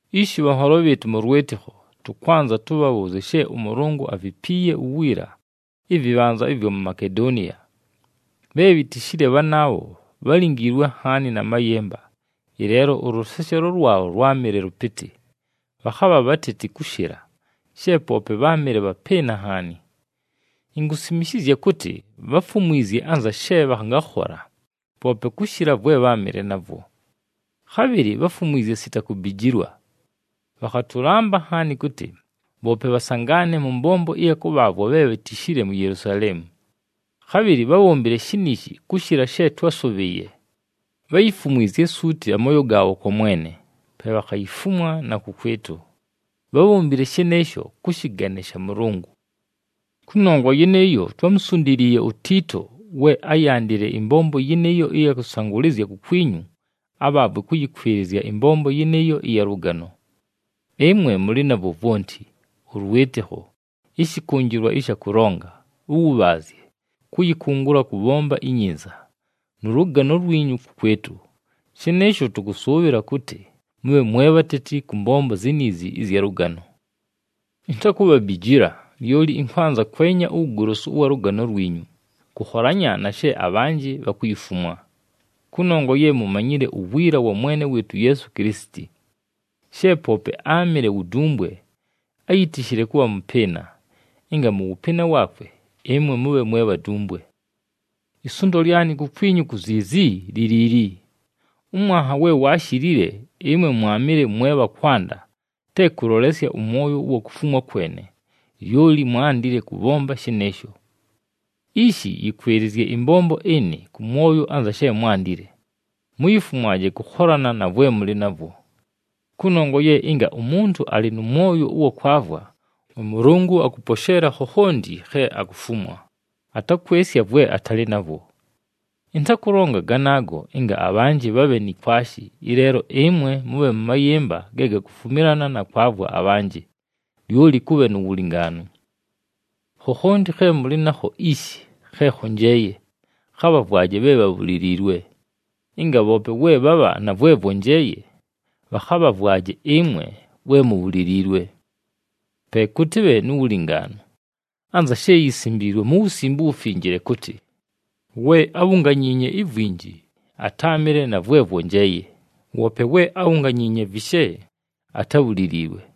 Ishi bhanholo bhɨɨtʉ mʉ lwɨtɨkho, tʉkwanza tʉbhabhʉʉzye she ʉMʉlʉngʉ avipiiye uwiila ɨvɨbhanza ɨvwa mu Makedoniya. Bhe bhitishile bhanaabho bhálingiilwe nhaani na mayɨmba, ɨleelo ʉlʉseshelo lwabho lwámɨle lʉpɨtɨ, bhakhabha bhateti kʉshɨla, she poope bháamɨle bhapɨɨna nhaani. Inkusimishizya kʉtɨ bháfumwizye anza she bhangakhola, poope kʉshɨla vwe bháamɨle navwo. Khabhɨlɨ bháfumwizye sita kubijilwa. Bhakhatʉlamba nhaani kʉtɨ, bhoope bhasangaane mʉ mbombo ɨya kʉbhaavwa bhe bhitishile mu Yelusaleemu. Khabhɨlɨ bhábhombile shiniishi kʉshɨla she twásʉbhɨɨye. Bháyifumwizye suuti amooyo gaabho kwa Mwene, pe bhakhayifumwa na kʉkwɨtʉ. Bhábhombile shɨnɨɨsho kʉ shɨgane sha Mʉlʉngʉ. Kʉnongwa yɨnɨɨyo, twámusundiliiye uTiito we áyandile ɨmbombo yɨnɨɨyo ɨya kʉsangʉlɨzya kukwinyu abhaavwe kʉyɨkwɨlɨzya ɨmbombo yɨnɨɨyo ɨya lʉgano. Ɨmwe mʉlɨ navwo vwonti, ʉlwɨtɨkho, ɨshɨkʉnjɨlwa ɨsha kʉlonga, ʉwʉbhaazye, kʉyɨkʉngʉla kʉbhomba inyinza, nʉ lʉgano lwinyu kʉkwɨtʉ. Shɨnɨɨsho, tʉkʉsʉʉbhɨla kʉtɨ mʉbhe mwe bhateti kʉ mbombo ziniizi ɨzya lʉgano. Intakubhabijila, lyoli ɨnkwanza kwenya uwugolosu ʉwa lʉgano lwinyu, kʉkholanya na she abhanjɨ bhakuyifumwa. Kʉnongwa ye mumanyile uwiila wa Mwene wɨɨtʉ uYeesu Kilisiti. She poope áamɨle wu dumbwe, áyitishile kʉbha mʉpɨɨna, ɨnga mʉ wʉpɨɨna waakwe, ɨmwe mʉbhe mwe bhadumbwe. Isundo lyanɨ kukwinyu ku ziizi, li liili: ʉmwanha we waashilile, ɨmwe mwaamɨle mwe bha kwanda, te kʉlolesya ʉmwoyo ʉwa kufumwa kwene, lyoli mwaandile kʉbhomba shɨnɨɨsho. Ishi, yɨkwɨlɨzye ɨmbombo ɨnɨ kʉ mwoyo anza she mwaandile, muyifumwaje kʉkholana na vwe mʉlɨ navwo. Kʉnongwa ye ɨnga umuntu alɨ nʉ mwoyo ʉwa kwavwa, ʉMʉlʉngʉ akʉposheela khokhonti khe akufumwa, atakwɨsya vwe atalɨ navwo. Ɨntakʉlonga ganaago ɨnga abhanjɨ bhabhe ni kwashi, ɨleelo ɨmwe mʉbhe mʉ mayɨmba ge gakufumilana na kwavwa abhanjɨ, lyoli kʉbhe nu wulingaanu. Khokhonti khe mʉlɨ nakho ishi khe khonjeeye, khabhavwaje bhe bhabhuliliilwe, ɨnga bhoope we bhabha na vwe vwonjeeye, bhakhabhavwaje ɨmwe we mubhuliliilwe. Pe kʉtɨbhe nu wulingaanu, anza she yisimbiilwe mu Wusimbe uWufinjile kʉtɨ, “We ábhunganyiinye ivwinji, atáamɨle na vwe vwonjeeye, woope we ábhunganyiinye vishe, atábhuliliilwe.”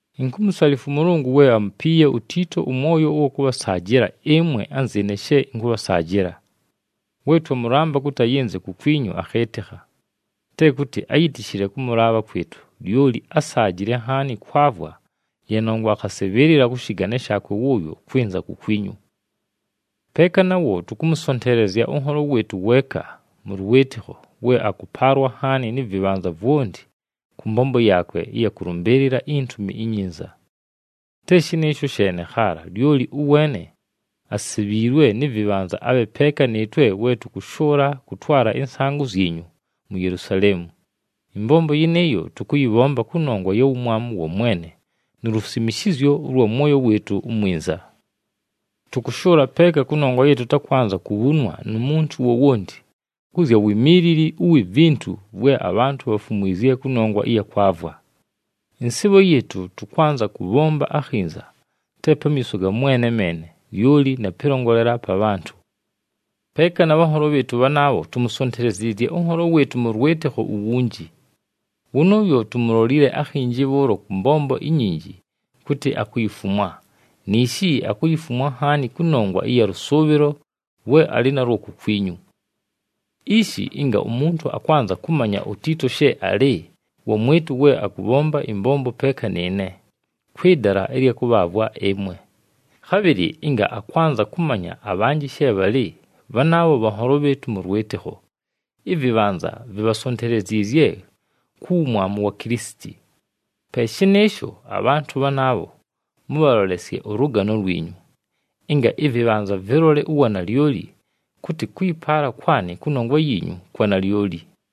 Inkumusalifwa ʉMʉlʉngʉ we amupiiye uTiito ʉmwoyo ʉwa kʉbhasaajɨla ɨmwe anzɨɨne she ɨnkʉbhasaajɨla. We twamʉlamba kʉtɨ ayɨnze kukwinyu, akhɨɨtɨkha. Te kʉtɨ áyitishile kʉmʉlaabha kwɨtʉ, lyoli ásaajile nhaani kwavwa, ye nongwa akhasɨbhɨɨlɨla kʉ shɨgane shaakwe wʉʉyo kwɨnza kukwinyu. Peeka nawo tʉkʉmʉsonteelezya ʉnholo wɨɨtʉ weeka mʉ lwɨtɨkho we akʉpaalwa nhaani nɨ vɨbhanza vwonti kʉ mbombo yaakwe ɨya kʉlʉmbɨɨlɨla iNtumi iNyinza. Te shɨnɨɨsho sheene khaala, lyoli ʉweene asebhiilwe nɨ vɨbhanza abhe peeka nɨɨtwe we tʉkʉshʉʉla kʉtwala ɨnsaangʉ zyinyu mu Yelusaleemu. Ɨmbombo yɨnɨɨyo tʉkʉyɨbhomba kʉnongwa ya wumwamu wa Mwene nu lusimishizyo ʉlwa mwoyo wɨɨtʉ umwinza. Tʉkʉshʉʉla peeka kʉnongwa ye tʉtakwanza kubhunwa nu muntu wowonti kʉ zya wimiilili uwi vintu vwe abhantʉ bhafumwizye kʉnongwa ɨya kwavwa. Ɨnsɨɨbho yɨɨtʉ, tʉkwanza kʉbhomba akhinza, te pamiiso ga Mwene meene, lyoli na pɨlongolela pa bhantʉ. Peeka na bhanholo bhɨɨtʉ bhanaabho, tumusonteleziizye ʉnholo wɨɨtʉ mʉ lwɨtɨkho uwunji. Wʉnʉʉyo tumulolile akhinji bhʉʉlo kʉ mbombo inyinji kʉtɨ akuyifumwa, niishi akuyifumwa nhaani kʉnongwa ɨya lʉsʉʉbhɨlo lwe alɨ nalwo kukwinyu. Ishi ɨnga umuntu akwanza kʉmanya uTiito she alɨ, wamwɨtʉ we akʉbhomba ɨmbombo peeka nɨɨne, kwɨ dala ɨlya kʉbhaavwa ɨmwe. Khabhɨlɨ ɨnga akwanza kʉmanya abhanjɨ she bhalɨ bhanaabho bhanholo bhɨɨtʉ mʉ lwɨtɨkho, ɨvɨbhanza vibhasonteleziizye ku wumwamu wa Kilisiti. Pe shɨnɨɨsho, abhantʉ bhanaabho mʉbhalolesye ʉlʉgano lwinyu, ɨnga ɨvɨbhanza vɨlole uwanalyoli kʉtɨ kʉyɨpaala kwanɨ kʉnongwa yiinyu kwa nalyoli.